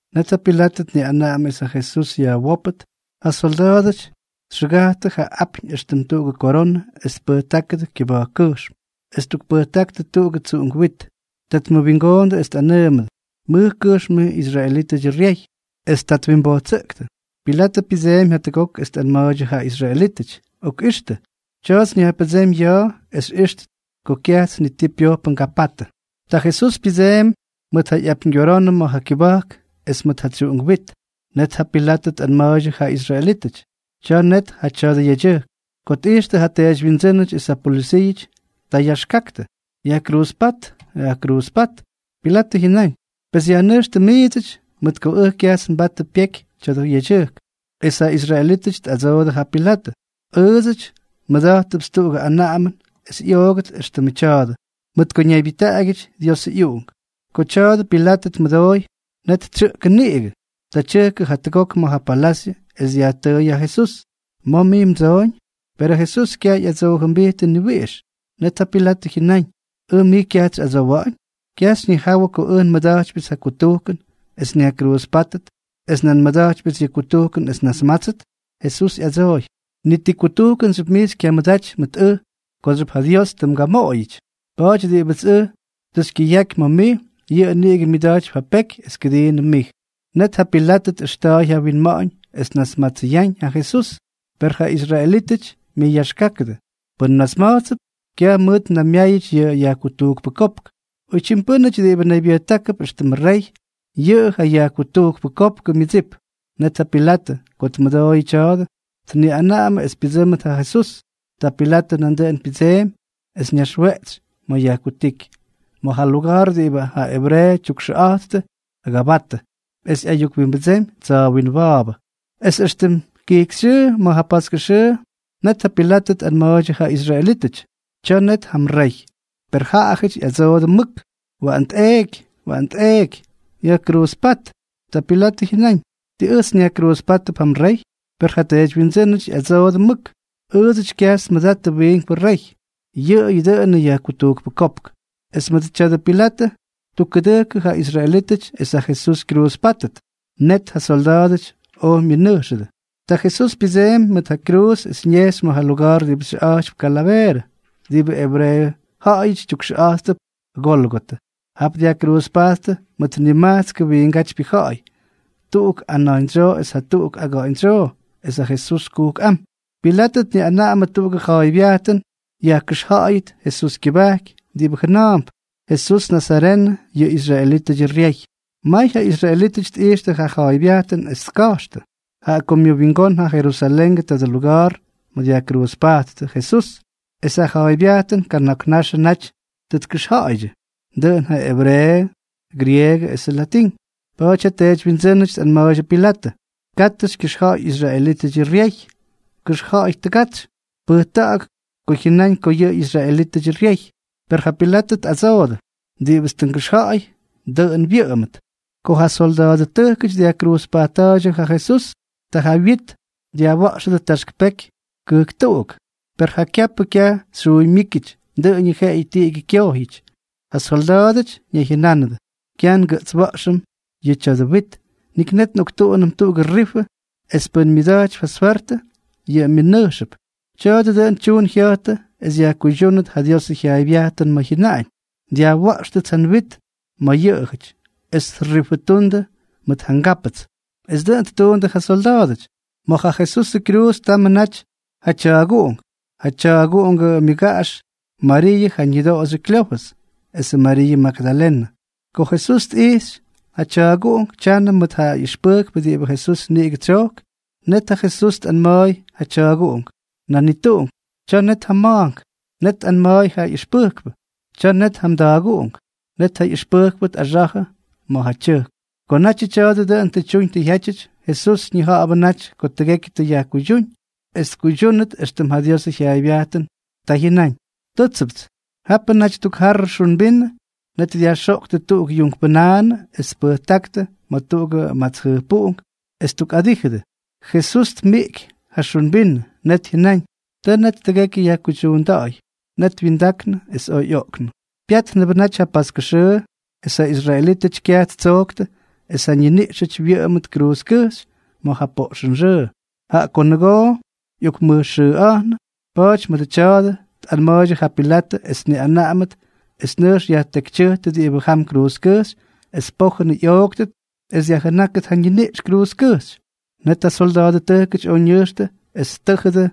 Net ja Pilatʉ tniꞌanaꞌamʉ es ja Jesús yajwópʉt. Ja solda̱a̱dʉty txʉgajttʉ ja apyñ éxtʉm tuꞌugʉ koronʉ es tpʉjtákʉdʉ kyʉba̱jkkʉjxm es ttukpʉjtáktʉ tuꞌugʉ tsuꞌunk wit. Ta tmʉwingoondʉ es tꞌanʉʉmʉdʉ: —¡Mʉj kʉjxm mij israelítʉdyʉ ryey! Es ta twimbojtsʉꞌktʉ. Pilatʉ pyʉdseemy jatʉgok es tꞌanma̱a̱ydyʉ ja israelítʉty: —¡Okꞌixtʉ! Tya̱a̱ts nyajpʉdsémy ya̱a̱ es xyꞌíxtʉt ko kyajts ni ti pyojpʉ ngapatʉ. Ta Jesús pyʉdseemy mʉt ja ꞌyapyñgyoronʉ ma̱ ja kyʉba̱jk es mʉt ja tsyuꞌunk wit. Net ja Pilatʉ tꞌanma̱a̱ydyʉ ja israelítʉty: —¡Tya̱a̱ net ja tya̱dʉ yedyʉjk! Ko tꞌijxtʉ ja teedywyindsʉ́nʉty es ja polʉsiiʉty, ta yaxkaktʉ: —¡Yajkruuzpát! ¡Yajkruuzpát! Pilatʉ jyʉnáñ: —Pes yajnʉjxtʉ miidsʉty, mʉt ko ʉj kyajts nbatʉ pyekyʉ tya̱dʉ yedyʉjk. Es ja israelítʉty tꞌadsoodʉ ja Pilatʉ: —Ʉʉdsʉty nmʉda̱jttʉpts tuꞌugʉ anaꞌamʉn es ꞌyoogʉt éxtʉmʉ tya̱a̱dʉ, mʉt ko ñaybyʉjtaꞌagyʉty Diosʉ ꞌyUꞌunk. Ko tya̱a̱dʉ Pilatʉ tmʉdooy, net tsyʉꞌkʉ niꞌigʉ. Ta tyʉjkʉ jatʉgok ma̱ ja palasyʉ es dyajtʉʉy ja Jesús: —¿Ma̱ mij mdsooñ? Perʉ Jesús kyaj ꞌyadsoojʉmbijtʉ ni wiꞌix. Net ja Pilatʉ jyʉnáñ: —¿Ʉj mij kyajts xyꞌadsowa̱ꞌa̱ñ? ¿Kyaj xyñijawʉ ko ʉj nmʉda̱jtypyʉts ja kutujkʉn es nyajkruuzpátʉt, es nan nmʉda̱jtypyʉts yʉ kutujkʉn es nnasmátsʉt? Jesús ꞌyadsooy: —Ni ti kutujkʉnxyʉp mij xykyamʉdaty mʉt ʉj kooxyʉp ja Dios tʉ mgamoꞌoyʉty. Pa̱a̱ty diꞌibʉts ʉj tʉ xykyʉyaky ma̱ mij, yʉꞌʉ niꞌigʉ myʉda̱jtypy ja peky es kʉdiinʉm mij. Net ja Pilatʉ tjaꞌʉxta̱a̱y ja winma̱ꞌa̱ñ es tnasmatsʉyáñ ja Jesús, per ja israelítʉty myʉyaxkákʉdʉ: —¡Pʉn mnasma̱jtsʉp, kyaj mʉʉt mnaymyáyʉty yʉ yajkutujkpʉ kopk! ¡Oytyim pʉ́nʉty diꞌibʉ naybyʉjtákʉp éxtʉmʉ rey, yʉꞌʉ ja yajkutujkpʉ kopkʉ myʉdsip! Net ja Pilatʉ, ko tmʉdooyʉ tya̱a̱dʉ, tniꞌanaꞌamʉ es pyʉdsʉ́mʉt ja Jesús. Ta Pilatʉ nandʉꞌʉn pyʉdseemy es ñaxweꞌtsy ma̱ yajkutíky, ma̱ ja luga̱a̱r diꞌibʉ ja ebreeʉ tyukxʉꞌa̱jtʉ Gabata, es ꞌyayukwimbʉdsemy Tsa̱a̱ Winwa̱a̱bʉ. Es éxtʉm kijkyxyʉʉ ma̱ ja paskʉ xʉʉ, net ja Pilatʉ tꞌanma̱a̱ydyʉ ja israelítʉty: —¡Tya̱a̱ net ja mrey! Per jaꞌajʉty ꞌyadsoodʉ mʉk: —¡Waꞌan tꞌeeky! ¡Waꞌan tꞌeeky! ¡Yajkruuzpát! Ta Pilatʉ jyʉnáñ: —¿Tii ʉjts nyajkruuzpátʉp ja mrey? Per ja teedywyindsʉ́nʉty ꞌyadsoodʉ mʉk: —Ʉʉdsʉty kyajts nmʉdattʉ wiinkpʉ rey, yʉꞌʉyʉ dʉꞌʉnʉ yajkutujkpʉ kopk. Es mʉdʉ tya̱a̱dʉ Pilatʉ ttukkʉdʉjkʉdʉ ja israelítʉty es ja Jesús kyruuzpátʉt. Net ja solda̱a̱dʉty oj myʉnʉjxʉdʉ. Ta Jesús pyʉdseemy mʉt ja kyruuz es ñejxy ma̱ ja luga̱a̱r diꞌibʉ xyʉꞌa̱jtypy Kalaveerʉ, diꞌibʉ ebreeʉ ja̱ꞌa̱yʉty tyukxʉꞌa̱jttʉp Gólgotʉ. Jap dyajkruuzpajttʉ mʉt nimajtskʉ wiingátypyʉ ja̱ꞌa̱y, tuꞌuk ana̱jñdsyoo es jatuꞌuk aga̱ꞌa̱ñdsyoo es ja Jesús kujkꞌám. Pilatʉ tniꞌanaꞌamʉ tuꞌugʉ ja̱a̱ybyajtʉn yajkʉxja̱ꞌa̱yʉt Jesús kyʉbajky diꞌibʉ jʉna̱a̱mp: “Jesús nazarenʉ, yʉ israelítʉdyʉ ryey.” May ja israelítʉty tꞌijxtʉ ja ja̱a̱ybyajtʉn es tka̱jxtʉ, jaꞌa ko myʉwingón ja Jerusalengʉ tadʉ luga̱a̱r ma̱ dyajkruuzpajttʉ Jesús, es ja ja̱a̱ybyajtʉn kana̱k naxʉ naty tʉ tkʉxja̱ꞌa̱ydyʉ, dʉꞌʉn ja ebreeʉ, grieegʉ esʉ latín. Pa̱a̱ty ja teedywyindsʉ́nʉty tꞌanma̱a̱ydyʉ Pilatʉ: —Katʉ xykyʉxja̱ꞌa̱y israelítʉdyʉ ryey. Kʉxja̱ꞌa̱y tʉgatsy. Pʉjta̱ꞌa̱k ko jyʉnáñ ko yʉꞌʉ israelítʉdyʉ ryey. Per ja Pilatʉ tꞌadsoodʉ: —Diꞌibʉts tʉ ngʉxja̱ꞌa̱y, dʉꞌʉn wyʉꞌʉmʉt. Ko ja solda̱a̱dʉtʉjkʉty dyajkruuzpajtta̱a̱ydyʉ ja Jesús, ta ja wyit dyajwa̱ꞌxʉdʉ taxk peky kʉjktuꞌuk. Per ja kyapʉ kyaj xyuymyíkyʉty, dʉꞌʉñʉ jeꞌeyʉ tiꞌigyʉ kyojyʉty. Ja solda̱a̱dʉty ñayjyʉnánʉdʉ: —Kyaj ngʉꞌtswa̱ꞌxʉm yʉ tya̱dʉ wit. Nik net nꞌoktuꞌunʉm tuꞌugʉ rifʉ es pʉ́n myʉda̱jtypy ja swertʉ, yʉꞌʉ yajnʉjxʉp. Tya̱a̱dʉ dʉꞌʉn tyuun jya̱jtʉ es yajkuydyúnʉt ja Diosʉ jyaaybyajtʉn ma̱ jyʉnaꞌañ: “Dyajwa̱ꞌxtʉts ja nwit ma̱ jaꞌajʉty, es trifʉtundʉ mʉt ja ngápʉts.” Es dʉꞌʉn ttuundʉ ja solda̱a̱dʉty. Ma̱ ja Jesusʉ kyruuz tamʉ naty ja tya̱a̱guꞌunk, ja tya̱a̱guꞌungʉ myʉgaꞌax, Mariiʉ ja ñʉdoꞌoxyʉ Kleofʉs, esʉ Mariiʉ Magdalenʉ. Ko Jesús tꞌijxy ja tya̱a̱guꞌunk tyanʉ mʉt ja ꞌyʉxpʉjkpʉ diꞌibʉ Jesús niꞌigʉ tsyojk, net ja Jesús tꞌanma̱a̱y ja tya̱a̱guꞌunk: —Nanituꞌunk, tya̱a̱ net ja mma̱a̱nk. Net tꞌanma̱a̱y ja ꞌyʉxpʉjkpʉ: —Ta net ja mda̱a̱guꞌunk. Net ja ꞌyʉxpʉjkpʉ tꞌaxa̱jʉ ma̱ ja tyʉjk. Ko natyʉ tya̱a̱dʉ dʉꞌʉn tʉ tyuñ tʉ jyátyʉty, Jesús ñija̱ꞌa̱bʉ naty ko tʉgekyʉ tʉ yajkuydyúñ, es tkuydyúnʉt éxtʉm ja Diosʉ jyaaybyajtʉn, ta jyʉnáñ: —Tʉ́tsʉpts. Japʉ naty tuk jarrʉ xun vinʉ. Net dyajxoꞌktʉ tuꞌuk yuunkpʉnaanʉ es tpʉjtáktʉ ma̱ tuꞌugʉ mats jʉjpuꞌunk es ttukꞌadíjʉdʉ. Jesús tmiꞌky ja xun vinʉ. Net jyʉnáñ: —Tʉ net tʉgekyʉ yajkuydyuunda̱ꞌa̱y. Net wyindaknʉ es oj ꞌyoꞌknʉ. Pyátnʉbʉ naty ja paskʉ xʉʉ, es ja israelítʉty kyaj ttsoktʉ es ja ñiniꞌxʉty wyʉꞌʉmʉt kruuzkʉjxy ma̱ ja poꞌxʉnxʉʉ, jaꞌa ko nʉgoo ꞌyokmʉjxʉꞌa̱jnʉ. Pa̱a̱ty mʉdʉ tya̱a̱dʉ tꞌanma̱a̱ydyʉ ja Pilatʉ es tniꞌanaꞌamʉt es nʉjx yajtekytyʉjtʉ diꞌibʉ jam kruuzkʉjxy es pojʉn ꞌyooktʉt es dyajjʉnákʉt ja ñiniꞌx kruuzkʉjxy. Net ja solda̱a̱dʉtʉjkʉty oj ñʉjxtʉ es ttʉ́jʉdʉ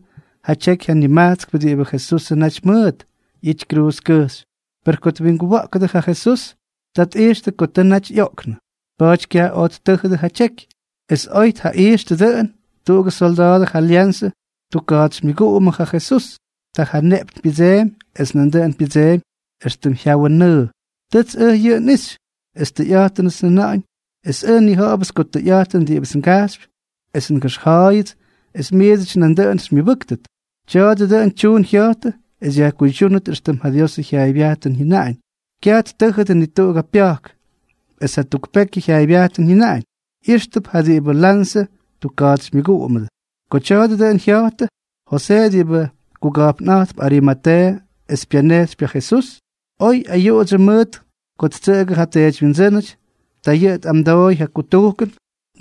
ja tyeky ja nimajtskpʉ diꞌibʉ Jesusʉ naty mʉʉt ꞌyity kruuzkʉjxy. Per ko twinguwa̱ꞌkʉdʉ ja Jesús, ta tꞌijxtʉ ko tʉ naty ꞌyoꞌknʉ. Pa̱a̱ty kyaj oj ttʉ́jʉdʉ ja tyeky. Es oy tjaꞌijxtʉ dʉꞌʉn, tuꞌugʉ solda̱a̱dʉ ja lyanzʉ ttukka̱a̱tsymyʉguꞌumʉ ja Jesús. Ta ja ñeꞌpyñ pyʉdseemy es nandʉꞌʉn pyʉdseemy éxtʉm jyawʉ nʉʉ. Tʉts ʉj yʉꞌʉ nꞌixy, es tʉyꞌa̱jtʉnts njʉna̱ꞌa̱ñ es ʉj nnija̱ꞌa̱bʉts ko tʉyꞌa̱jtʉn diꞌibʉts ngajxypy es ngʉxja̱ꞌa̱yʉts es miidsʉty nandʉꞌʉn xymyʉbʉ́ktʉt. Tya̱a̱dʉ dʉꞌʉn tyuun jya̱jtʉ es yajkuydyúnʉt éxtʉm ja Diosʉ jyaaybyajtʉn jyʉnaꞌañ: “Kyaj ttʉ́jʉdʉ ni tuꞌugʉ pya̱jk.” Es jatuk pekyʉ ja̱a̱ybyajtʉn jyʉnaꞌañ: “ꞌYíxtʉp ja diꞌibʉ lanzʉ tukka̱a̱tsymyʉguꞌumʉ.” Ko tya̱a̱dʉ dʉꞌʉn jya̱jtʉ, Josee diꞌibʉ kuga̱jpnꞌa̱jtp Arimateeʉ es pyanejxypy ja Jesús, oy ayuꞌudsyʉ mʉt ko ttsʉꞌʉgʉ ja teedywyindsʉ́nʉty, ta yʉꞌʉ tꞌamdooy ja kutujkʉn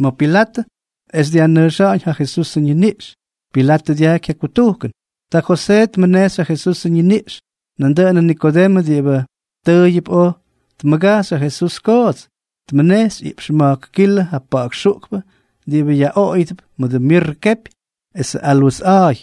ma̱ Pilatʉ es dyajnʉjxa̱ꞌa̱ñ ja Jesusʉ ñiniꞌx. Pilatʉ dyajky ja kutujkʉn. Ta Josee tmʉnejxy ja Jesusʉ ñiniꞌx. Nandʉꞌʉnʉ Nikodemʉ diꞌibʉ tʉʉyʉp oj tmʉgajxy ja Jesús koots, tmʉnejxy iꞌpx ma̱jk kilʉ ja pa̱ꞌa̱k xuꞌkpʉ diꞌibʉ yaꞌoꞌoyʉdʉp mʉdʉ mirrʉ kepy esʉ alwes a̱a̱y.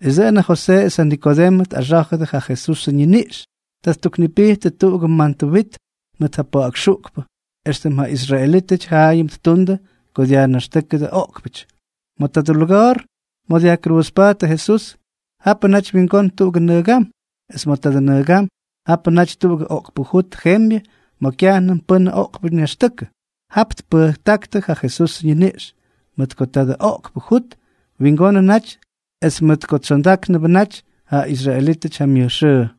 Es dʉꞌʉn ja Josee es ja Nikodemʉ tꞌaxá̱jʉdʉ ja Jesusʉ ñiniꞌx. Ta ttuknipijttʉ tuꞌugʉ mantʉ wit mʉt ja pa̱ꞌa̱k xuꞌkpʉ, éxtʉm ja israelítʉty jaayʉm ttundʉ ko dyajnaxtʉ́kʉdʉ oꞌkpʉty. Ma̱ tadʉ luga̱a̱r ma̱ dyajkruuzpajttʉ Jesús, japʉ naty wingón tuꞌugʉ nʉgam, es ma̱ tadʉ nʉgam japʉ naty tuꞌugʉ oꞌkpʉ jut jembyʉ ma̱ kyajnʉm pʉ́n oꞌkpʉ ñaxtʉkʉ. Jap tpʉjtáktʉ ja Jesusʉ ñiniꞌx, mʉt ko tadʉ oꞌkpʉ jut wingonʉ naty es mʉt ko tsyonda̱ꞌa̱gánʉbʉ naty ja israelítʉty ja myʉj xʉʉ.